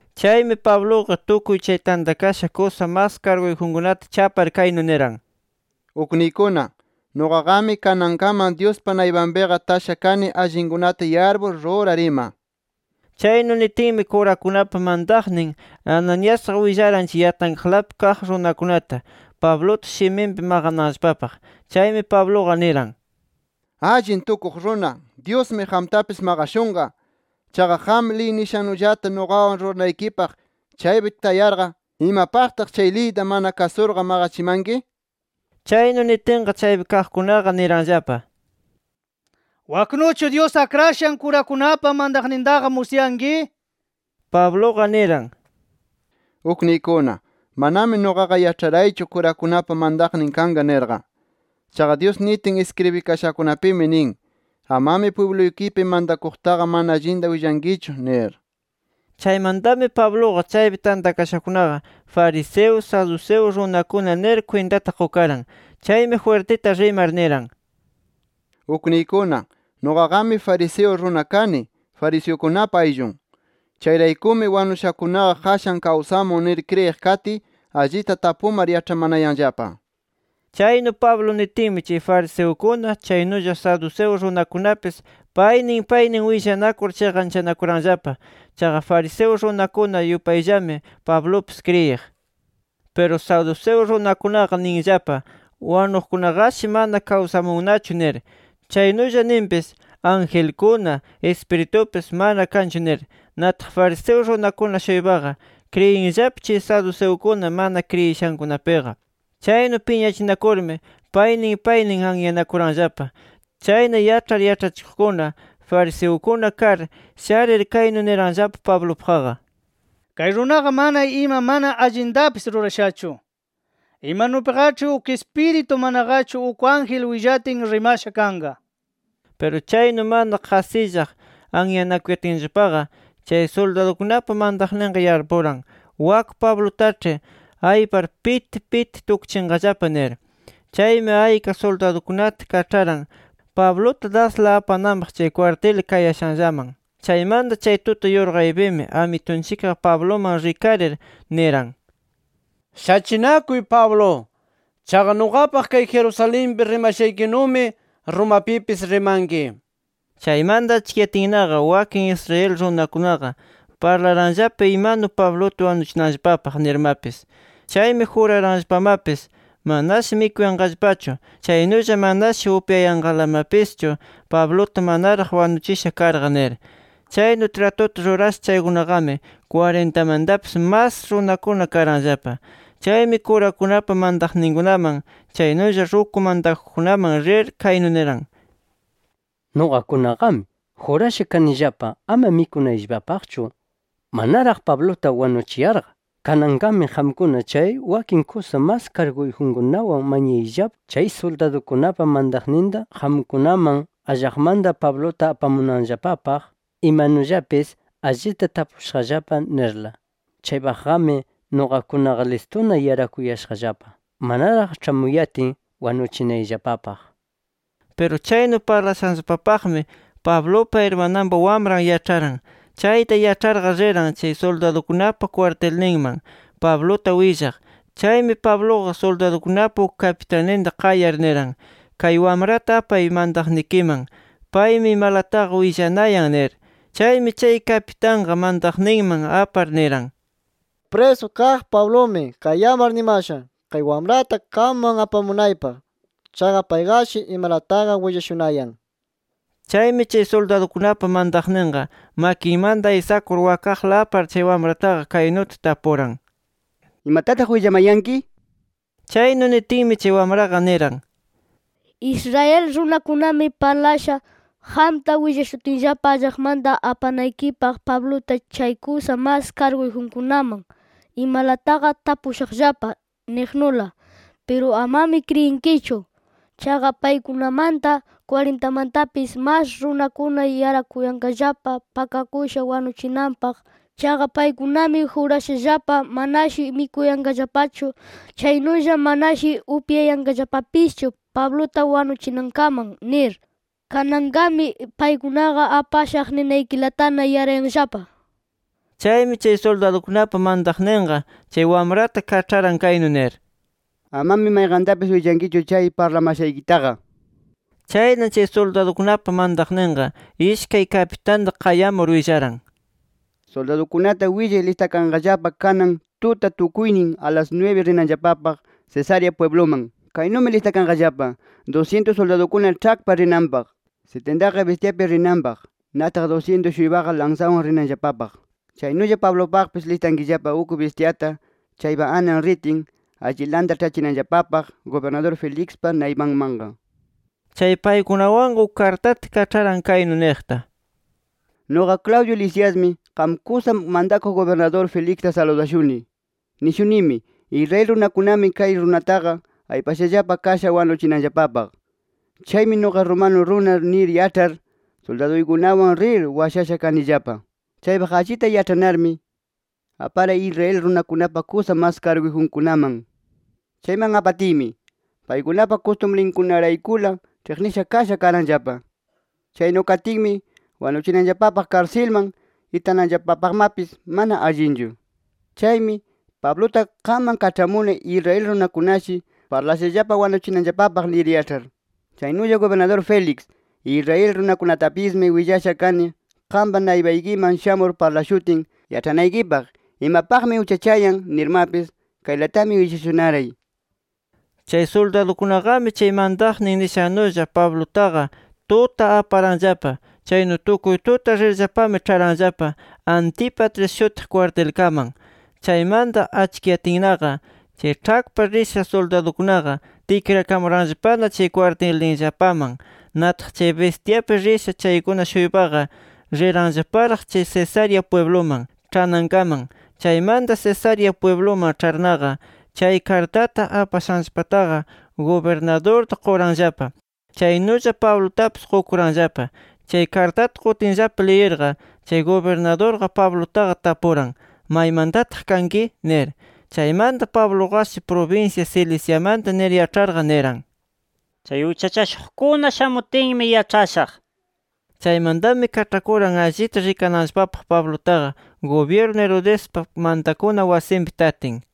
Chaymi Pabluqa tukuy chay tantakasha kusa mas karguyjunkunata chapar kaynu niran: —Ukniykuna, nuqaqami kanankaman Dyuspa naypanpiqa tasha kani allinkunata yarpur, rurar ima. Chaynu nitinmi, kurakunapa mantaqnin Ananiasqa willaran, chay yatankaqlapi kaq runakunata, Pabluta shiminpi maqananllapapaq. Chaymi Pabluqa niran: —¡Allin tukuq runa, Dyusmi qamtapis maqashunqa! Chaqa qam, liy nishannullata nuqawan ruranaykipaq chaypi tayarqa, ¿imapaqtaq liyta mana kasurqa maqachimanki? nir. Chaynu nitinqa, chaypi kaqkunaqa niranllapa: —¿Waknuchu Dyus akrashan kurakunapa mantaqnintaqa musyanki? nir. Pabluqa niran: —Ukniykuna, manami nuqaqa yaĉharaychu kurakunapa mantaqnin kanqa nirqa. Chaqa Dyus nitin iskribikashakunapimi nin: ‘Amami pwibluykipi mantakuqtaqa mana allinta willankichu’ nir. Chaymantami Pabluqa chaypi tantakashakunaqa fariseo, saduceo runakuna nir kwintata qukaran. Chaymi jwirtita rimar niran: —Ukniykuna, nuqaqami fariseo runa kani, fariseukunapa ayllun. Chayraykumi, wanushakunaqa qashan kawsamun nir kriyiq katiy, allita tapumar yaĉhamanayanllapa. Chaynu Pablo nitinmi, chay fariseukuna, chaynulla saduceo runakunapis, paynin paynin willanakur, chiqanchanakuranllapa. Chaqa fariseo runakuna yupayllami Pablupis kriyiq. Piru saduceo runakunaqa ninllapa, wanuqkunaqashi mana kawsamunnachu nir. Chaynulla ninpis, angelkuna, ispiritupis, mana kanchu nir. Nataq fariseo runakuna-shuypaqa kriyinllapa chay saduceukuna mana kriyishankunapiqa. Chaynu piñachinakurmi, paynin paynin anyanakuranllapa. Chayna, yaĉhar yaĉhachikuqkuna fariseukuna kar, sharir kaynu niranllapa Pablupaqqa: —Kay runaqa mana ima mana allintapis rurashachu. Imanupiqaĉhi uk ispiritu, manaqachu uk ángel willatin rimasha kanqa nir. Piru chaynu mana qasillaq anyanakuyatinllapaqa, chay suldadukunapa mantaqninqa yarpuran: Wak Pablutaĉhi aypar piti piti tukchinqallapa nir. Chaymi ayka suldadukunata kaĉharan Pabluta dasla apananpaq chay kwartil kayashanllaman. Chaymanta chay tuta yurqaypimi Amitunchikqa Pabluman rikarir niran: “Shachinakuy Pablo. Chaqa nuqapaq kay Jerusalenpi rimashaykinumi, Romapipis rimanki” nir. Chaymanta achkiyatinnaqa, wakin Israel runakunaqa parlaranllapa imanu Pabluta wanuchinanllapapaq nirmapis. Chaymi juraranllapamapis, manashi mikuyanqallapachu, chaynulla manashi upyayanqalamapischu Pabluta manaraq wanuchisha karqa nir. Chaynu tratuta rurasha chaykunaqami, kwarintamantapis mas runakuna karanllapa. Chaymi kurakunapa mantaqninkunaman, chaynulla ruku mantakuqkunaman rir kaynu niran: —Nuqakunaqami jurasha kanillapa ama mikunayllapapaqchu, manaraq Pabluta wanuchiyarqa. Kananqami qamkuna chay wakin kusa mas karguyjunkunawan mañayllapa chay suldadukunapa mantaqninta qamkunaman allaqmanta Pabluta apamunanllapapaq, ‘Imanullapis allita tapushaqllapa’ nirla. Chaypaqqami, nuqakunaqa listuna yarakuyashaqllapa, manaraq ĉhamuyatin wanuchinayllapapaq. Piru chaynu parlashanllapapaqmi, Pablupa irmananpa wamran yaĉharan. Chayta yaĉharqa, riran chay suldadukunapa kwartilninman Pabluta willaq. Chaymi, Pabluqa suldadukunapa uk kapitanninta qayar niran: —Kay wamrata apay mantaqnikiman. Paymi imalataqa willanayan nir. Chaymi, chay kapitanqa mantaqninman apar niran: —Chay prisu kaq Pablumi qayamar nimasha, kay wamrata qamman apamunaypaq. Chaqa payqashi imalataqa willashunayan nir. Chaymi, chay suldadukunapa mantaqninqa, makinmanta aysakur wakaqla apar chay wamrataqa kaynuta tapuran: —¿Imatataq willamanayanki? nir. Chaynu nitinmi, chay wamraqa niran: —Israel runakunami parlasha, qamta willashutinllapa allaqmanta apanaykipaq Pabluta chay kusa mas karguyjunkunaman, ‘Imalataqa tapushaqllapa’ niqnula. Piru amami kriyinkichu. Chaqa, paykunamanta kwarintamantapis mas runakuna yarakuyanqallapa pakakusha wanuchinanpaq. Chaqa paykunami jurashallapa manashi mikuyanqallapachu, chaynulla manashi upyayanqallapapischu Pabluta wanuchinankaman nir. Kananqami, paykunaqa ‘Apashaq’ ninaykilatana yarayanllapa. Chaymi, chay suldadukunapa mantaqninqa chay wamrata kaĉharan kaynu nir: —Amami mayqantapis willankichu chay parlamashaykitaqa. Chayna chay suldadukunapa mantaqninqa, ishkay kapitanta qayamur willaran: —Suldadukunata willay listakanqallapa kanan tuta tukuynin, a las nwibi rinanllapapaq Cesarea pwibluman. Kaynumi listakanqallapa: Dusyintus suldadukuna ĉhakpa rinanpaq, sitintaqa bistyapi rinanpaq, nataq dusyintus-shuypaqa lansawan rinanllapapaq. Chaynulla Pablupaqpis listankillapa uk bistyata chaypa anan ritin, allilanta ĉhachinaykillapapaq gubirnadur Felixpa naypanmanqa. Chay paykunawanqa uk kartata kaĉharan kaynu niqta: Nuqa Claudio Lisiasmi, qam kusa mantakuq gubirnadur Felixta saludashuni. Nishunimi: Israel runakunami, kay runataqa aypashallapa kasha wanuchinanllapapaq. Chaymi “Nuqa romano runa” nir yaĉhar, suldaduykunawan rir washasha kanillapa. Chaypaq allita yaĉhanarmi, aparay Israel runakunapa kusa mas karguyjunkunaman. Chayman apatiymi, paykunapa kustumrinkunaraykula ĉhiqnisha kasha karanllapa. Chaynu katinmi, wanuchinanllapapaq, karsilman itananllapapaqmapis mana allinchu. Chaymi, Pabluta qamman kaĉhamuni Israel runakunashi parlashallapa wanuchinanllapapaq nir yaĉhar. Chaynulla gubirnadur Félix, Israel runakunatapismi willasha kani qampa naypaykiman shamur parlashutin yaĉhanaykipaq, imapaqmi uchachayan nirmapis. Kaylatami willashunaray. Chay suldadukunaqami, chay mantaqnin nishannulla Pablutaqa tuta aparanllapa. Chaynu tukuy tuta rirllapami, ĉharanllapa Antípatris shutiq kwartilkaman. Chaymanta achkiyatinnaqa, chay ĉhakpa risha suldadukunaqa tikrakamuranllapana chay kwartilninllapaman. Nataq chay bistyapi risha chaykuna-shuypaqa, riranllaparaq chay Cesarea pwibluman ĉhanankaman. Chaymanta Cesarea pwibluman ĉharnaqa, chay kartata apashanllapataqa gubirnadurta quranllapa. Chaynulla Pablutapis qukuranllapa. Chay kartata qutinllapa liyirqa, chay gubirnadurqa Pablutaqa tapuran: —¿Maymantataq kanki? nir. Chaymanta Pabluqashi prubinsya Ciliciamanta nir yaĉharqa, niran: —Chay uchachashuqkuna shamutinmi yaĉhashaq nir. Chaymantami, kaĉhakuran allita rikananllapapaq Pablutaqa, gubyirnu Herodespa mantakuna wasinpi tatin.